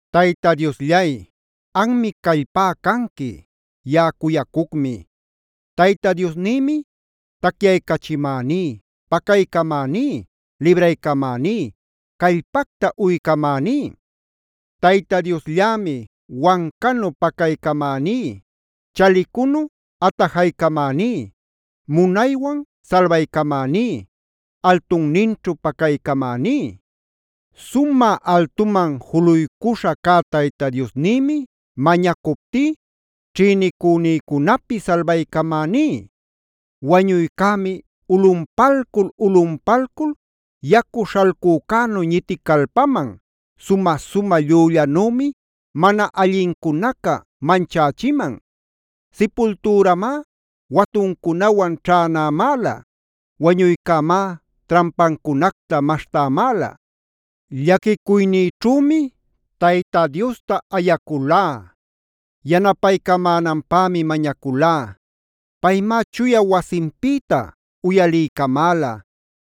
Tayta Diosllay, anmi callpá canqui; yaꞌa cuyacucmi. Tayta Diosnïmi tacyaycachimäní, pacaycamäní, libraycamäní, callpacta uycamäní. Tayta Diosllämi wancanu pacaycamäní, chalicunu atajaycamäní, munaywan salbaycamäní, altunninćhu pacaycamäní. Sumä altuman juluycuśha cä Tayta Diosnïmi mañacuptí ćhïnicünïcunapi salbaycamäní. Wañuycämi ulꞌunpalcul-ulꞌunpalcul yacu śhalcücänu ñiticalpaman, sumä-sumä llüllanümi mana allincunaca manchächiman. Sipultüramá watuncunawan ćhänämäla. Wañuycämá trampancunacta maśhtämäla. Llaquicuynïćhümi Tayta Diosta ayaculá; yanapaycamänanpämi mañaculá. Paymá chuya wasinpïta uyaliycamäla;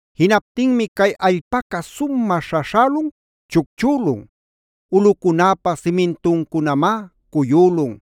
Jinaptinmi cay allpaca sumä śhaśhälun chucchülun. Ulꞌucunäpa simintuncunamá cuyülun.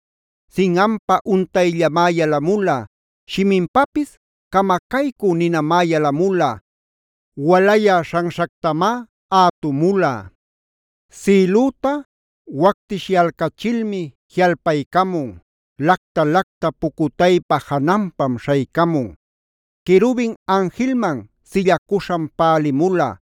Sinꞌanpa untayllamá yalamula, shiminpapis camacaycü ninamá yalamula, walayä śhanśhactamá ätumula. Sïlüta wactishyalcachilmi jiꞌalpaycamun. Lacta-lacta pucutaypa jananpam śhaycamun. Querubin anjilman sillacuśham pälimula.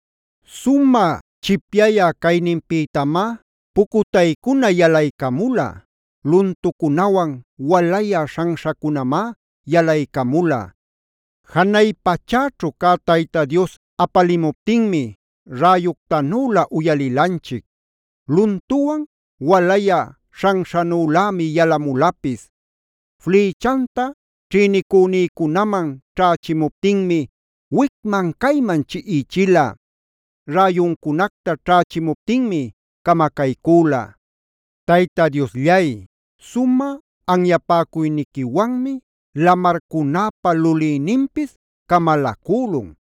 Sumä chipyayä cayninpïtamá pucutaycuna yalaycamula. Luntucunawan walayä śhanśhacunamá yalaycamula. Janay pachäćhu cä Tayta Dios apalimuptinmi räyuctanülä uyalilanchic. Luntuwan, walayä śhanśhanülämi yalamulapis. Flïchanta ćhïnicünïcunaman ćhächimuptinmi wicman-cayman chiꞌichila. Räyuncunacta ćhächimuptinmi camacaycüla. Tayta Diosllay, sumä anyapäcuyniquiwanmi lamarcunäpa lulïninpis camalacülun.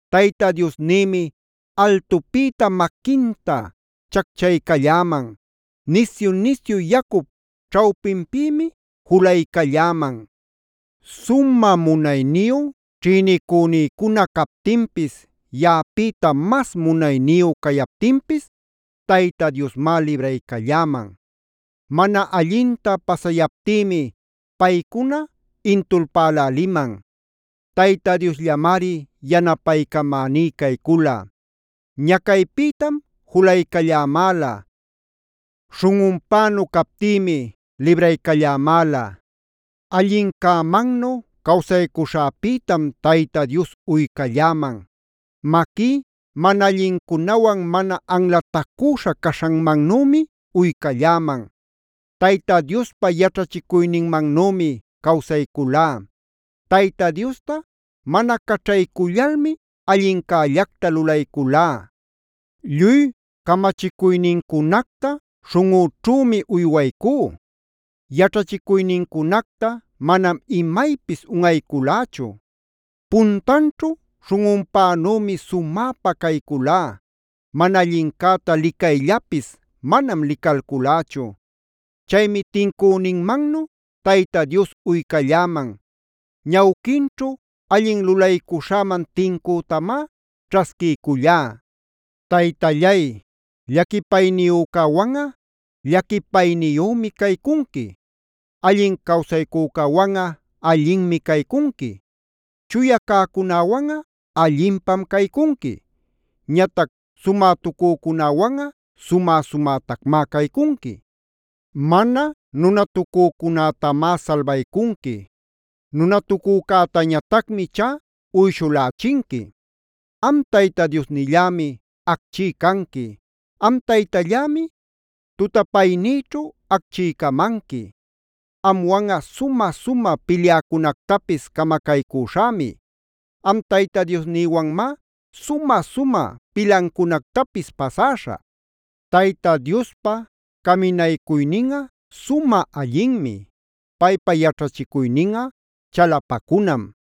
Tayta Diosnïmi altupïta maquinta chacchaycalläman. Nisyu-nisyu yacup ćhawpinpïmi julaycalläman. Sumä munayniyu ćhïnicünïcuna captinpis, yaꞌapïta mas munayniyu cayaptinpis Tayta Diosmá libraycalläman. Mana allinta pasayaptïmi paycuna intulpäläliman. Tayta Diosllamari yanapaycamäní caycula. Ñacaypïtam julaycallamäla. Śhunꞌunpänu captïmi libraycallamäla. Allincämannu cawsaycuśhäpïtam Tayta Dios uycalläman. Maquí mana allincunawan mana anlatacüśha caśhanmannümi uycalläman. Tayta Diospa yaćhachicuyninmanümi cawsayculá. Tayta Diosta mana caćhaycullalmi allincällacta lulayculá. Lluy camachicuynincunacta śhunꞌüćhümi uywaycú. Yaćhachicuynincunacta manam imaypis unꞌayculächu. Puntanćhu śhunꞌunpänümi sumäpa cayculá. Mana allincäta licayllapis manam licalculächu. Chaymi tincünïmannu Tayta Dios uycalläman. Ñawquinćhu allin lulaycuśhäman tincütamá ćhasquiycullá. Taytallay, llaquipayniyücäwanꞌa llaquipayniyümi caycunqui, allin cawsaycücäwanꞌa allinmi caycunqui, chuya cäcunäwanꞌa allinpam caycunqui. Ñatac sumätucücunäwanꞌa sumä-sumätacmá caycunqui. Mana nunatucücunätamá salbaycunqui. Nunatucücätañatacmi ichá uyshulächinqui. Am Tayta Diosnillämi acchí canqui. Am Taytallämi tutapaynïćhu acchiycamanqui. Amwanꞌa sumä-sumä pilyäcunactapis camacaycüśhämi. Am Tayta Diosnïwanmá sumä-sumä pilancunactapis pasäśhä. Tayta Diospa caminaycuyninꞌa sumä allinmi. Paypa yaćhachicuyninꞌa chalapacunam.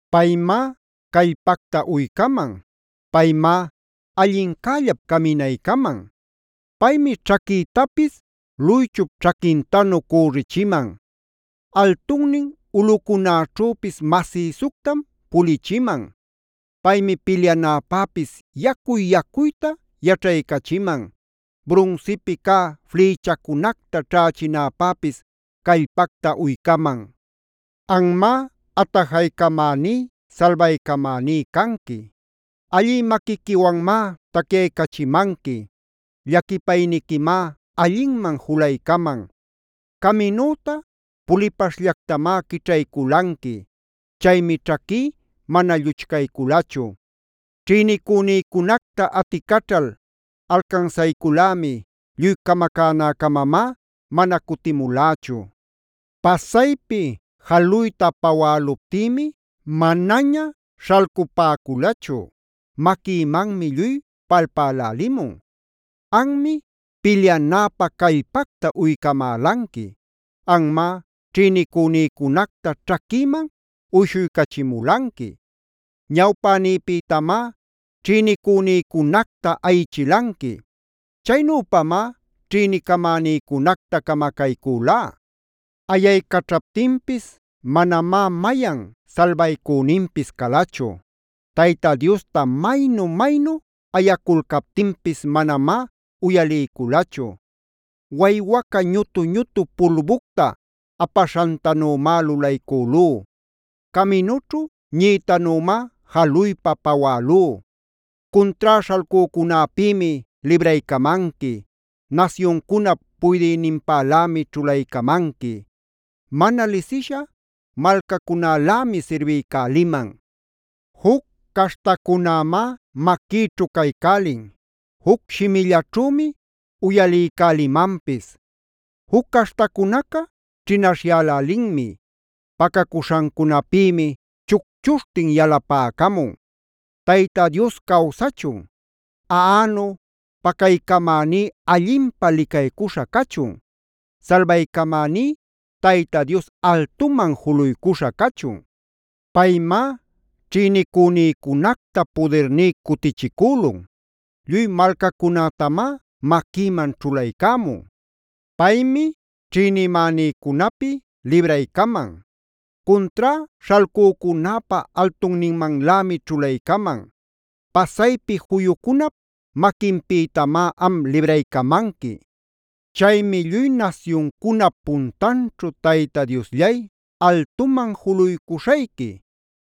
Paymá callpacta uycaman. Paymá allincällap caminaycaman. Paymi ćhaquïtapis luychup ćhaquintanu cürichiman. Altunnin ulꞌucunäćhüpis masïsuctam pulichiman. Paymi pilyanäpäpis yacuy-yacuyta yaćhaycachiman. Brunsipi cä flïchacunacta ćhächinäpäpis callpacta uycaman. Anmá atajaycamäní salbaycamäní canqui. Allï maquiquiwanmá tacyaycachimanqui. Llaquipayniquimá allinman julaycaman. Caminüta pulipaśhllactamá quićhayculanqui. Chaymi ćhaquí mana lluchcayculachu. Ćhïnicünïcunacta aticaćhal alcansayculämi. Lluy camacänäcamamá mana cutimulächu. Pasaypi jaluyta pawäluptïmi manaña śhalcupäculachu. Maquïmanmi lluy palpälälimun. Anmi, pilyanäpä callpacta uycamälanqui. Anmá ćhïnicünïcunacta ćhaquïman uyshuycachimulanqui. Ñawpänïpïtamá ćhïnicünïcunacta ayichilanqui. Chaynüpamá ćhïnicamänïcunacta camacayculá. Ayaycaćhaptinpis manamá mayan salbaycüninpis calachu. Tayta Diosta maynu-maynu ayaculcaptinpis manamá uyaliyculachu. Waywaca ñutu-ñutu pulbucta apaśhantanümá lulaycülú. Caminućhu ñiꞌitanümá jaluypa pawälú. Cuntrá śhalcücunäpïmi libraycamanqui. Nasyuncunap puydïninpalämi ćhulaycamanqui. Mana lisisha malcacunälämi sirbiycäliman. Juc caśhtacunämá maquïćhu caycälin. Juc shimillaćhümi uyaliycälimanpis. Juc caśhtacunaca ćhinaśhyälälinmi. Pacacuśhancunapïmi chucchuśhtin yalapäcamun. ¡Tayta Dios cawsachun! ¡Aꞌanug pacaycamäní allinpä licaycuśha cachun! ¡Salbaycamäní Tayta Dios altuman juluycuśha cachun! Paymá ćhïnicünïcunacta pudirní cutichicülun. Lluy malcacunätamá maquïman ćhulaycämun. Paymi ćhïnimänïcunapi libraycaman; cuntrá śhalcücunäpä altunninmanlämi ćhulaycaman. Pasaypi juyucunap maquinpïtamá am libraycamanqui. Chaymi lluy nasyuncunap puntanćhu Tayta Diosllay, altuman juluycuśhayqui.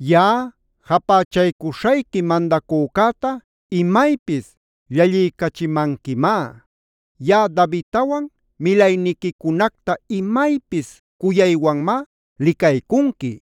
Yaꞌa japächaycuśhayqui mandacücäta imaypis llalliycachimanquimá. Yaꞌa Davidtawan milaynincunacta imaypis cuyaywanmá licaycunqui.